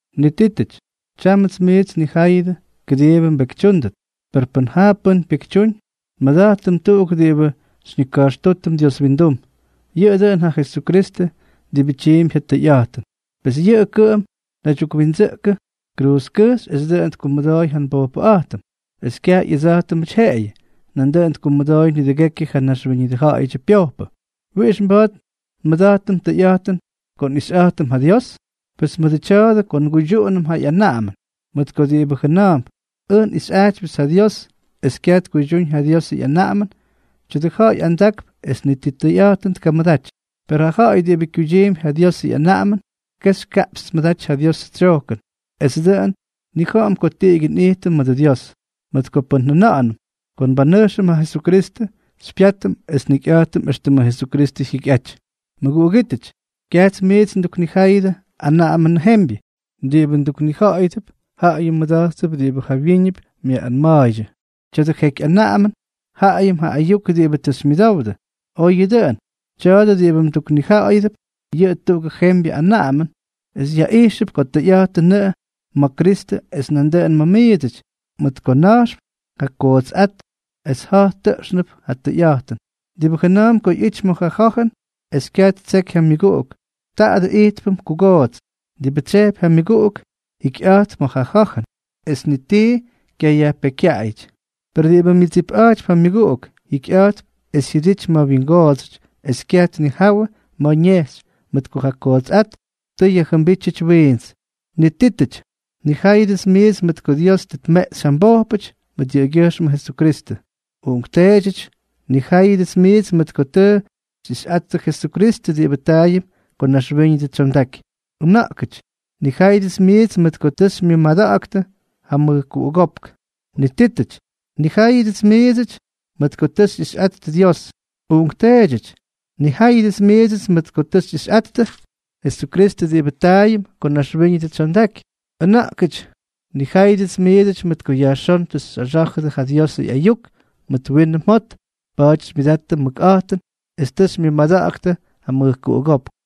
Nitítʉty, tyámʉts miits nnijáyʉdʉ kʉdiibʉ mbekytyúndʉt. Per pʉn jaa pʉ́n pyekytyúñ, nmʉda̱jtʉm tuꞌuk diꞌibʉ xyñika̱jxtútʉm Dios windum. Yʉꞌʉ dʉꞌʉn ja Jesukristʉ diꞌibʉ tyiimpy ja tʉyꞌa̱jtʉn. Pes yʉꞌʉ kʉꞌʉm naydyukwindsʉꞌkʉ kruuzkʉjxy es dʉꞌʉn tkumʉdooy ja nbojpʉꞌa̱jtʉm. Es kyaj ꞌyʉdsa̱jtʉmʉty jeꞌeyʉ, nandʉꞌʉn tkumʉdooy nidʉgekyʉ ja naxwíñʉdʉ ja̱ꞌa̱yʉdyʉ pyojpʉ. ¿Wiꞌix mba̱a̱t nmʉda̱jtʉm tʉyꞌa̱jtʉn ko nꞌixyꞌa̱jtʉm ja Dios? Pes mʉdʉ tya̱a̱dʉ ko nguydyuꞌunʉm ja ꞌyanaꞌamʉn. Mʉt ko diꞌibʉ jʉna̱a̱mp: “Ʉj nꞌixyꞌa̱jtypyʉts ja Dios”, es kyaj tkuydyúñ ja Diosʉ ꞌyanaꞌamʉn, tya̱dʉ ja̱ꞌa̱y andakp es ni ti tʉyꞌa̱jtʉn tkamʉdaty. Per ja ja̱ꞌa̱y diꞌibʉ kyuydyiimpy ja Diosʉ ꞌyanaꞌamʉn, kexy kaꞌpxy tmʉdaty ja Diosʉ tsyojkʉn, es dʉꞌʉn nnija̱ꞌa̱m ko tiꞌigyʉ nꞌijtʉm mʉdʉ Dios. Mʉt ko pʉn njʉna̱ꞌa̱nʉm ko nbanʉjxʉm ja Jesukristʉ, xypyátʉm es njikyꞌa̱jtʉm éxtʉmʉ Jesukristʉ jyikyꞌajty. Mʉguꞌugítʉty, kyajts miits nduknijáyʉdʉ anaꞌamʉnʉ jembyʉ. Diꞌibʉ nduknija̱ꞌa̱yʉdʉp, jaꞌayʉm mmʉda̱jtʉp diꞌibʉ jawyíñʉp myaꞌꞌanma̱a̱ydyʉ. Tya̱dʉ jeky anaꞌamʉn, jaꞌayʉm ja ayuk diꞌibʉ tʉ xymyʉdowdʉ. Oyʉ dʉꞌʉn, tya̱a̱dʉ diꞌibʉ nduknija̱ꞌa̱yʉdʉp, yʉꞌʉ tuꞌugʉ jembyʉ anaꞌamʉn, es yaꞌijxʉp ko tʉyꞌa̱jtʉnʉꞌʉ ma̱ Kristʉ es nandʉꞌʉn ma̱ miidsʉty, mʉt ko na̱jxp ja kugootsꞌát es ja̱j tʉꞌxnʉp ja tʉyꞌa̱jtʉn. Diꞌibʉ jʉna̱a̱mp ko ꞌyity ma̱ ja ja̱jʉn es kyaj ttseky ja myʉguꞌuk, taadʉ ijtpʉm kugoots. Diꞌibʉ tsyejpy ja myʉguꞌuk, jikyꞌa̱jtp ma̱ ja ja̱jʉn, es ni ti kyayajpekykyaꞌayʉty. Per diꞌibʉ myʉdsipꞌa̱jtypy ja myʉguꞌuk, jikyꞌa̱jtp es jyʉdity ma̱ wyingoodsʉty, es kyaj tnijawʉ ma̱ ñejxy, mʉt ko ja kootsꞌát tʉ yajjʉmbítyʉty wiints. Nitítʉty, nnijáyʉdʉts miidsʉty mʉt ko Dios tʉ tmeꞌxy ja mbojpʉty mʉt yʉꞌʉgyʉjxmʉ Jesukristʉ. Uꞌunkteedyʉty, nnijáyʉdʉts miits mʉt ko tʉ xyꞌixyꞌattʉ Jesukristʉ diꞌibʉ taayʉm ko naxwíñʉdʉ tsyondaky. Ʉna̱ꞌkʉty, nnijáyʉdʉts miits mʉt ko tʉ xymyʉmada̱ꞌa̱ktʉ ja mʉjkuꞌugópk. Nitítʉty, nnijáyʉdʉts miidsʉty mʉt ko tʉ xyꞌixyꞌattʉ Dios. Uꞌunkteedyʉty, nnijáyʉdʉts miits mʉt ko tʉ xyꞌixyꞌattʉ Jesukristʉ diꞌibʉ taayʉm ko naxwíñʉdʉ tsyondaky. Ʉna̱ꞌkʉty, nnijáyʉdʉts miits mʉt ko yajxón tʉ xyꞌaxá̱jʉdʉ ja Diosʉ ꞌyayuk mʉt winʉ mjot. Pa̱a̱ty xymyʉdattʉ mʉkꞌa̱jtʉn es tʉ xymyʉmada̱ꞌa̱ktʉ ja mʉjkuꞌugópk.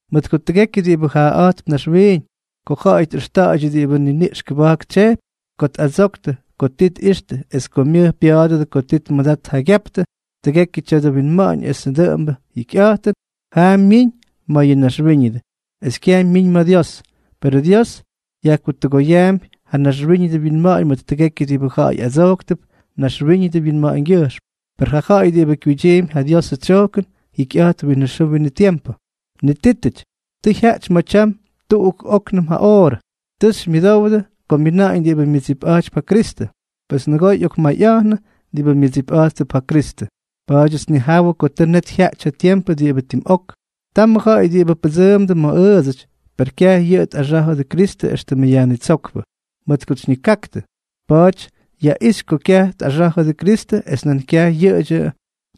Mʉt ko tʉgekyʉ diꞌibʉ jaaꞌa̱jtp naxwiiñ, ko ja̱ꞌa̱y tꞌʉxta̱ꞌa̱ydyʉ diꞌibʉ niniꞌx kʉba̱jk tsyejpy, ko tꞌadsoktʉ ko tii tꞌixtʉ es ko myʉj pya̱a̱dʉdʉ ko tii tmʉdat tjaygyaptʉ, tʉgekyʉ tya̱dʉ winma̱ꞌa̱ñ esʉ dʉꞌʉmbʉ jikyꞌa̱jtʉn jaa myiñ ma̱ yʉ naxwíñʉdʉ, es kyaj myiñ ma̱ Dios. Perʉ Dios yajkutʉgoyaampy ja naxwíñʉdʉ winma̱ꞌa̱ñ mʉt tʉgekyʉ diꞌibʉ ja̱ꞌa̱y adsojktʉp naxwíñʉdʉ winma̱ꞌa̱ñgyʉjxm, per ja ja̱ꞌa̱y diꞌibʉ kyuydyiimpy ja Diosʉ tsyojkʉn, jikyꞌa̱jtp winʉ xʉʉ winʉ tiempʉ. Nitítʉty, tʉ jyaꞌty ma̱ tyam tuꞌuk óknʉm ja oorʉ. Tʉ xymyʉdowdʉ ko myina̱ꞌa̱ñ diꞌibʉ myʉdsipꞌa̱jtypy ja Kristʉ. Pes nʉgoo ꞌyokmayꞌa̱jnʉ diꞌibʉ myʉdsipꞌa̱jttʉp ja Kristʉ. Pa̱a̱dyʉts nnijawʉ ko tʉ net jyaꞌty ja tiempʉ diꞌibʉ tim ok. Tamʉ ja̱ꞌa̱y diꞌibʉ pʉdsʉʉmdʉ ma̱ ʉʉdsʉty, per kyaj yʉꞌʉ tꞌaxá̱jʉdʉ Kristʉ éxtʉmʉ Yajnitsókpʉ. Mʉt kots xyñikaktʉ, pa̱a̱ty yaꞌixy ko kyaj tꞌaxá̱jʉdʉ Kristʉ es nan kyaj yʉꞌʉdyʉ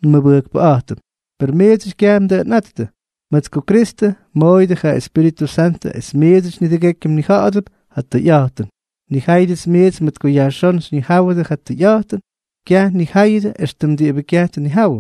nmʉmʉbʉjkpʉꞌa̱jtʉm. Per miidsʉty kyaj mdʉꞌʉnꞌáttʉ, mʉt ko Kristʉ mmooyʉdʉ ja Espíritʉ Santʉ es miidsʉty nidʉgekyʉ mnija̱ꞌa̱dʉp ja tʉyꞌa̱jtʉn. Nnijáyʉdʉts miits mʉt ko yajxón xyñijáwʉdʉ ja tʉyꞌa̱jtʉn, kyaj nnijáyʉdʉ éxtʉm diꞌibʉ kyaj tnijawʉ.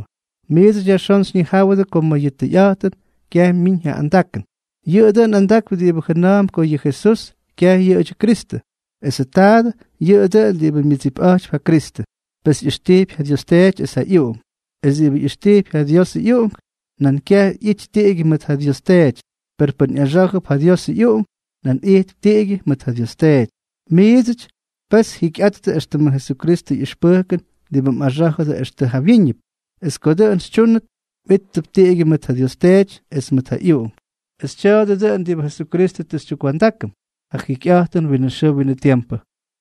Miidsʉty yajxón xyñijáwʉdʉ ko ma̱ yʉ tʉyꞌa̱jtʉn, kyaj myiñ ja andakʉn. Yʉꞌʉ dʉꞌʉn andakp diꞌibʉ jʉna̱a̱mp ko yʉ Jesús kyaj yʉꞌʉdyʉ Kristʉ. Esʉ taadʉ yʉꞌʉ dʉꞌʉn diꞌibʉ myʉdsipꞌa̱jtypy ja Kristʉ, pes ꞌyʉxtijpy ja Dios Teety es ja ꞌyUꞌunk. Es diꞌibʉ ꞌyʉxtijpy ja Diosʉ ꞌyUꞌunk, nan kyaj ꞌyity tiꞌigyʉ mʉʉt ja Dios Teety. Per pʉ́n ꞌyaxá̱jʉp ja Diosʉ ꞌyUꞌunk, nan ijtp tiꞌigyʉ mʉt ja Dios Teety. Miidsʉty, pes jikyꞌattʉ éxtʉmʉ Jesukristʉ ꞌyʉxpʉjkʉn diꞌibʉ mꞌaxá̱jʉdʉ extʉ jawyíñʉp. Es ko dʉꞌʉn xytyúnʉt, mꞌíttʉp tiꞌigyʉ mʉt ja Dios Teety es mʉt ja ꞌyUꞌunk. Es tya̱a̱dʉ dʉꞌʉn diꞌibʉ Jesukristʉ tʉ xytyukwa̱ndákʉm, ja jikyꞌa̱jtʉn winʉ xʉʉ winʉ tiempʉ.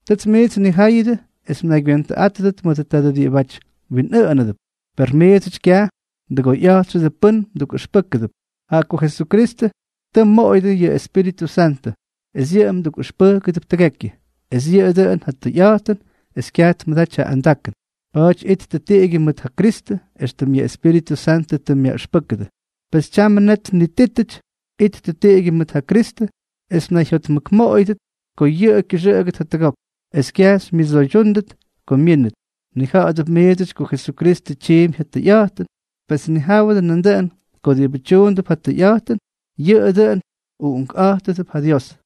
Tʉts miits nnijáyʉdʉ es mnaygywentʉꞌátʉdʉt mʉdʉ tadʉ diꞌibʉty mwinꞌʉʉnánʉdʉp. Per miidsʉty kyaj mdʉgoyꞌa̱jtxʉdʉ pʉ́n mdukꞌʉxpʉ́kʉdʉp, jaꞌa ko Jesukristʉ tʉ mmoꞌoyʉdʉ yʉ Espíritʉ Santʉ, es yʉꞌʉ mdukꞌʉxpʉjkʉdʉp tʉgekyʉ. Es yʉꞌʉ dʉꞌʉn ja tʉyꞌa̱jtʉn es kyaj tmʉdaty ja andakʉn. Pa̱a̱ty ittʉ tiꞌigyʉ mʉt ja Kristʉ, éxtʉm yʉ Espíritʉ Santʉ tʉ myaꞌʉxpʉ́kʉdʉ. Pes tyamʉ net nitítʉty, ittʉ tiꞌigyʉ mʉt ja Kristʉ es mnayjotmʉkmoꞌoyʉdʉt ko yʉꞌʉ kyʉxʉꞌʉgʉt jatʉgok, es kyaj xymyʉdsoydyúndʉt ko myínʉt. Mnija̱ꞌa̱dʉp miidsʉty ko Jesukristʉ tyiimpy ja tʉyꞌa̱jtʉn. Pes nijáwʉdʉ nandʉꞌʉn ko diꞌibʉ tyuundʉp ja tʉyꞌa̱jtʉn, yʉꞌʉ dʉꞌʉn uꞌunkꞌa̱jttʉp ja Dios.